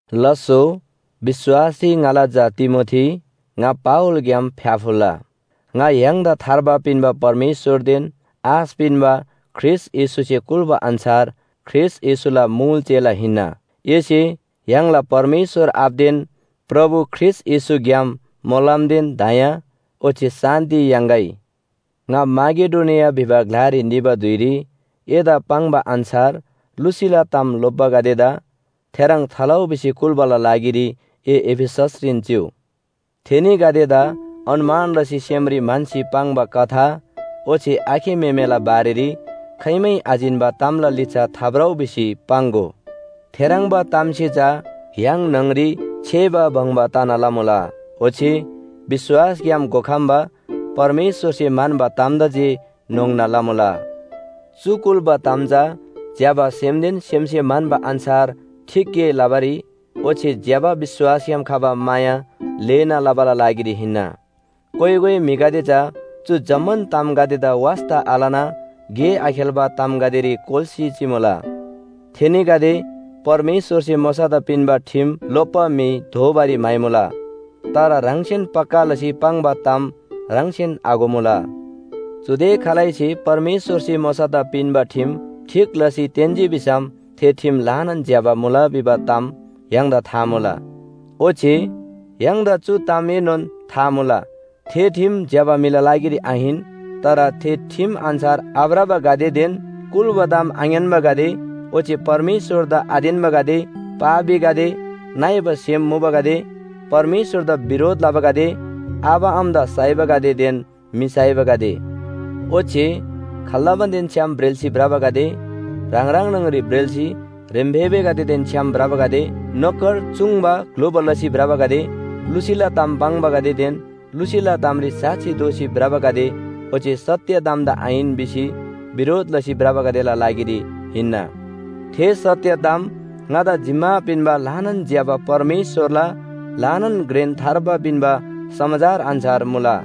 लास्‍सो, विश्‍वासरी ङाला झा तिमोथी, ङा पावलग्‍याम फ्‍याफुल्‍ला। ङा य्‍हाङदा थार्बा पिन्‍बा परमेश्‍वरदेन आश पिन्‍बा ख्रीष्‍ट येशूसे कुल्‍बा अन्‍छार ख्रीष्‍ट येशूला मुल चेला हिन्‍ना। एसे य्‍हाङला परमेश्‍वर आबादेन प्रभु ख्रीष्‍ट येशूग्‍याम मोलमदेन दया ओच्‍छे शान्‍ति याङ्‌गै। ङा माकेडोनिया भिबा ग्‍लारी निबा धुइरी एदा पाङ्बा अन्‍छार लुसीला ताम लोप्‍बागदेदा थेह्रङ् थालउ भिसी कुल्‍बाला लागिरी ए एफिससरीन चिउ। थेनीगदेदा अनुमान लसी सेमरी म्‍हन्‍सी पाङ्बा कथा ओच्‍छे आखे म्‍हेमेला बारेरी खाइमै आजिन्‍बा तामला लिच्‍छा थाभ्रउ भिसी पाङ्‍गो। थेह्रङ्बा तामसे चा य्‍हाङ न्‍हङरी छेबा बङ्बा तना लमुला, ओच्‍छे विश्‍वासग्‍याम घोखम्‍बा परमेश्‍वरसे म्‍हन्‍बा तामदा जे न्‍होङ्ना लमुला। चु कुल्‍बा ताम चा ज्‍यबा सेमदेन सेमसे म्‍हन्‍बा अन्‍छार ठीक गे लबारी ओच्‍छे ज्‍यबा विश्‍वासग्‍याम खबा माया ल्‍हेना लबाला लागिरी हिन्‍ना। कोइ कोइ म्‍हिगदे चा चु जम्‍मान तामगदेदा वास्‍ता आलना गे आखेल्‍बा तामगदेरी कोल्‍सी चिमुला। थेनीगदे परमेश्‍वरसे मोशादा पिन्‍बा ठिम लोप्‍बा म्‍हि दोबारीम म्‍हाइमुला, तर ह्राङसेन पक्‍का लसी पाङ्बा ताम ह्राङसेन आघोमुला। चुदे खालैसे परमेश्‍वरसे मोशादा पिन्‍बा ठिम ठीक लसी तेन्‍जी भिसम थे ठिम ल्‍हानान ज्‍यबा मुला भिबा ताम य्‍हाङदा था मुला। ओच्‍छे य्‍हाङदा चु तामएनोन था मुला, थे ठिम ज्‍यबा म्‍हिला लागिरी आहिन। तर थे ठिम अन्‍छार आभ्रबागदेदेन कुल्‍बा ताम आङ्‌यान्‍बागदे ओच्‍छे परमेश्‍वरदा आतेन्‍बागदे, पापीगदे, नइबा सेम मुबागदे, परमेश्‍वरदा बिरोध लबागदे, आबा आमादा साइबागदेदेन म्‍हि साइबागदे, ओच्‍छे खाल्‍दमानदेन छ्‌याम ब्रेल्‍सी भ्रबागदे, ह्राङ ह्राङ न्‍हङरीन ब्रेल्‍सी ह्रेम्‍फेबेगदेदेन छ्‌याम भ्रबागदे, नोकर चूङ्‍बा ग्‍लुबा लसी भ्रबागदे, लुसीला ताम पाङ्बागदेदेन लुसीला तामरी साक्षी दोसी भ्रबागदे ओच्‍छे सत्‍य तामदा आहिन भिसी बिरोध लसी भ्रबागदेला लागिरी हिन्‍ना। थे सत्‍य ताम ङादा जिम्‍मा पिन्‍बा ल्‍हानान ज्‍यबा परमेश्‍वरला ल्‍हानान घ्रेन थार्बा पिन्‍बा समाचार अन्‍छार मुला।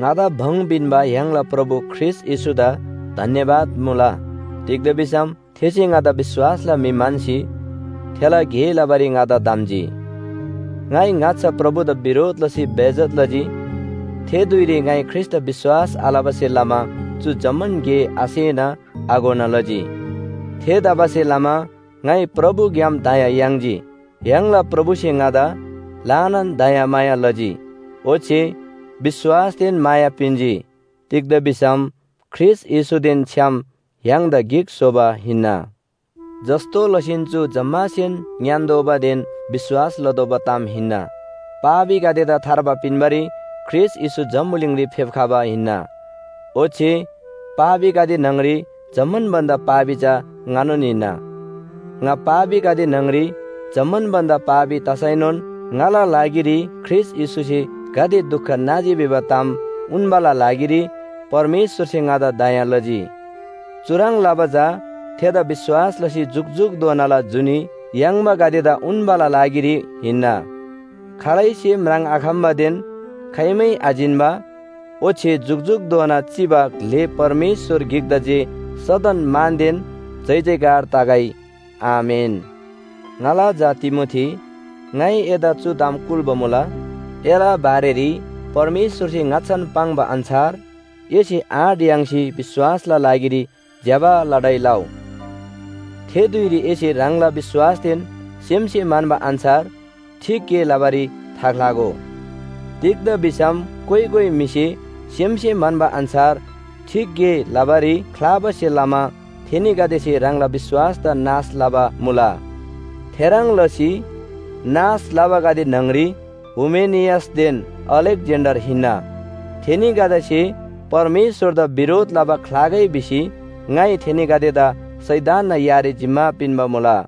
ङादा भङ पिन्‍बा य्‍हाङला प्रभु ख्रीष्‍ट येशूदा धन्‍यवाद मुला, तिग्‍दा भिसम थेसे ङादा विश्‍वासला म्‍हि म्‍हन्‍सी थेला गे लबारी ङादा धम्‍जी। ङाइ ङाच्‍छा प्रभुदा बिरोध लसी बेइज्‍जत लजी। थे धुइरी ङाइ ख्रीष्‍टदा विश्‍वास आलबासे लमा चु जम्‍मान गे आसेना आघोना लजी। थेतबासेलमा ङाइ प्रभुग्‍याम दया याङ्जी। य्‍हाङला प्रभुसे ङादा ल्‍हानान दयामाया लजी। ओच्‍छे विश्‍वासदेन माया पिन्‍जी। तिग्‍दा भिसम ख्रीष्‍ट येशूदेन छ्‌याम य्‍हाङदा गिक स्‍होबा हिन्‍ना। जस्‍तो लसीन चु जम्‍मासेन ङ्‌यान्‍तोःबादेन विश्‍वास लतोःबा ताम हिन्‍ना। पापीगदेदा थार्बा पिन्‍बारी ख्रीष्‍ट येशू जम्‍बुलिङरी फेप्‍खबा हिन्‍ना। ओच्‍छे पापीगदे न्‍हङरी जम्‍मान भन्‍दा पापी चा ङानोन हिन्‍ना। ङा पापीगदे न्‍हङरी जम्‍मान भन्‍दा पापी तसैनोन ङाला लागिरी ख्रीष्‍ट येशूसे गाते दुख नाजी भिबा ताम उन्‍बाला लागिरी परमेश्‍वरसे ङादा दया लजी। चुह्रङ् लबा चा थेदा विश्‍वास लसी जुकजुकधोनाला जुनी याङ्बागदेदा उन्‍बाला लागिरी हिन्‍ना। खालैसे म्राङ्‍आखम्‍बादेन खाइमै आजिन्‍बा ओच्‍छे जुकजुकधोना चिबा ग्‍ले परमेश्‍वर गिकदा जे सदन मानदेन जयजयकार तगै। आमेन। ङाला झा तिमोथी, ङाइ एदा चु ताम कुल्‍बा मुला, एला बारेरी परमेश्‍वरसे ङाच्‍छान पाङ्बा अन्‍छार एसे आँट याङ्सी विश्‍वासला लागिरी ज्‍यबा लडाइ लउ। थे धुइरी एसे ह्राङला विश्‍वासदेन सेमसे म्‍हन्‍बा अन्‍छार ठीक गे लबारी थाख्‍लागो। तिग्‍दा भिसम कोइ कोइ म्‍हिसे सेमसे म्‍हन्‍बा अन्‍छार ठीक गे लबारी ख्‍लाबासे लमा थेनीगदेसे ह्राङला विश्‍वासदा नाश लबा मुला। थेह्रङ् लसी नाश लबागदे न्‍हङरी हुमेनियसदेन अलेक्‍जेन्‍डर हिन्‍ना। थेनीगदेसे परमेश्‍वरदा बिरोध लबा ख्‍लागै भिसी ङाइ थेनीगदेदा शैतानना यारी जिम्‍मा पिन्‍बा मुला।